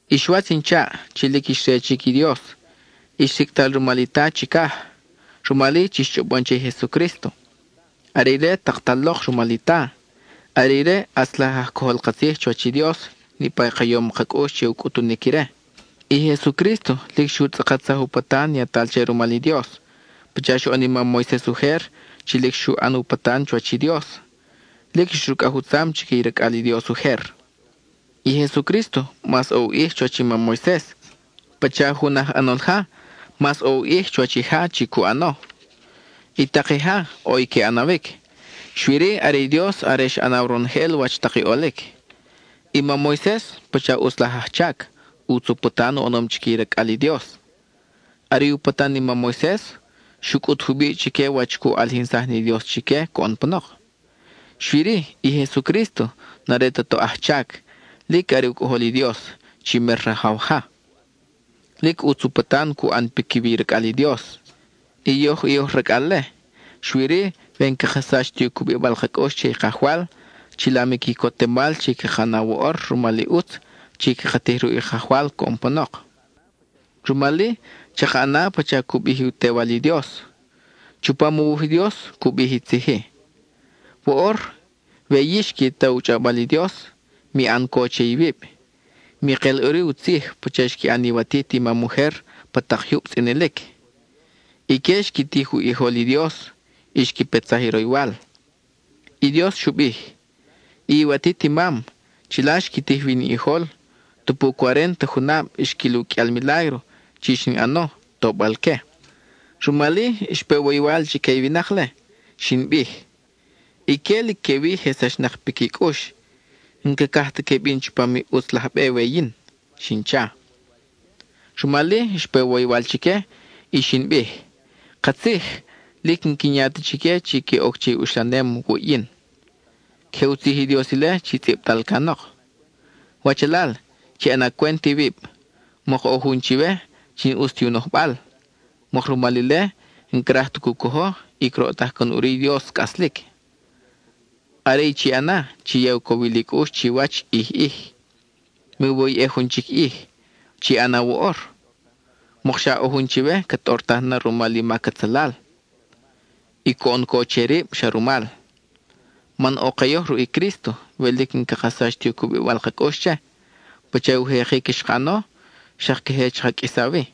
Ix watz in chaʼ, chi lic ix re chic i Dios, ix sicʼtal rumal i Ta chicaj, rumal-i, chix chʼobon che i Jesucrísto: are ire taktal lok rumal i Ta, are ire i ʼatz laj aj cojol ka tzij chuwach i Dios niʼpa i ka yom ka cʼux che u cʼutunic ire. I Jesucrísto lic xu tzʼakatsaj u patan yatal che rumal i Dios, pacha xoʼon i mam Moises ujer, chi lic xu ʼan u patan chuwach i Dios, lic xrucʼaj u tzam chique i racʼal i Dios ujer. I Jesucrísto mas ʼo u ʼij chuwach i mam Moises, pacha jun aj ʼanol ja, mas ʼo u ʼij chuwach i ja chi cu ʼano. I tak i ja, ʼo ni que ʼanawic, xui-ri are i Dios are xa ʼanaw ronojel wach tak i ʼolic. I mam Moises, pacha ʼutz laj ajchac, ʼutz u patan u ʼanom chique i racʼal i Dios. Are i u patan i mam Moises, xu cʼut jubiʼ chique wach cu ʼalijinsaj ni Dios chique coʼon panok. Xui-ri, i Jesucrísto n-are ta toʼ ajchac, lic are u Cʼojol i Dios, chi mer Rajaw ja. Lic ʼutz u patan cu ʼan piquiwi i racʼal i Dios, y yoj i oj racʼal-le, xui-ri we n-caka sach ti u cubibal ka cʼux che i Kajwal, chilam i quicotemal chi caka na woʼor rumal i ʼutz chi caka tij ruʼ i Kajwal coʼon panok. Rumal-i, chaka ʼana pacha cu bij u Tewal i Dios. Chupam u wuj i Dios cu bij i tzij-i: Woʼor we yix qui ta u chʼawbal i Dios, mi ʼan co che iwib, mi kel ʼuri u tzij pacha xqui ʼan iwatit i mam ujer pa tak jyub tzʼinilic. Ique xqui tij u ʼijol i Dios, (y xqui petsaj i roywal). (I Dios xu bij): I iwatit i mam chila xqui tij wi in ʼijol, tupu cuarénta junab xquil u qʼuial milágro chi xin ʼano, tobal-que. Rumal-i xpe woywal chique i winak-le. Xin bij: “Ique lic quewi je sachnak piqui cʼux; n-cacaj ta que bin chupam i ʼutz laj be we yin,” xin cha. Rumal-i, xpe woywal chique, y xin bij: “Katzij, lic n-quin ya ta chique chi que oc che i uxlanem wuʼ yin.” (Queje u tzij i Dios ile chi tzʼibtal canok.) Wachalal, chi ʼana cwent iwib, mok ʼo jun chiwe, chi n-ʼus ti u nojbal. Mok rumal ile, n-craj ta cu cojo, y croʼtaj can ʼuri i Dios cʼaslic. Are i chi ʼana, chi ya u cowil i cʼux chiwach ʼij ʼij. Miwoyʼej jun chic ʼij; chi ʼana woʼor, mokxa ʼo jun chiwe ca tʼortaj na rumal i mac atzalal, y coʼon co che rib xa rumal. Man ʼo ke yoj ruʼ i Crísto we lic n-caka sach ti u cubibal ka cʼux che; pacha u jekic xka ʼano, xak queje chaka qʼuisa wi.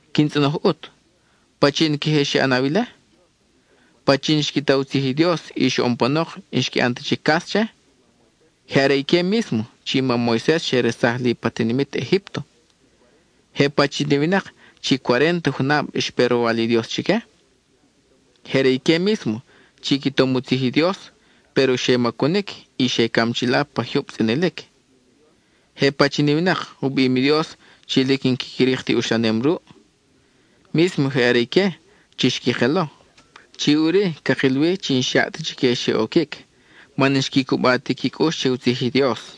Quin tzʼonoj ʼut: ¿Pachin queje xe ʼanaw ile? ¿Pachin xqui ta u tzij i Dios y xoʼon panok n-xqui ʼan ta chic cas che? Je are ique mísmo chi mam Moises xe resaj li pa tinimit Egípto. ¿Je pachin i winak chi cuarénta junab xpe roywal i Dios chique? Je are ique mísmo chi qui tom u tzij i Dios péro xe macunic y xe cam chila pa jyub tzʼinilic. ¿Je pachin i winak u bim i Dios chi lic n-quiqui rik ti uxlanem ruʼ? Mísmo je are ique chi xqui kelo. Chi ʼuri, cakil wi chi n-xyaʼ ta chique xe oquic, man n-xqui cuba ti qui cʼux che u tzij i Dios.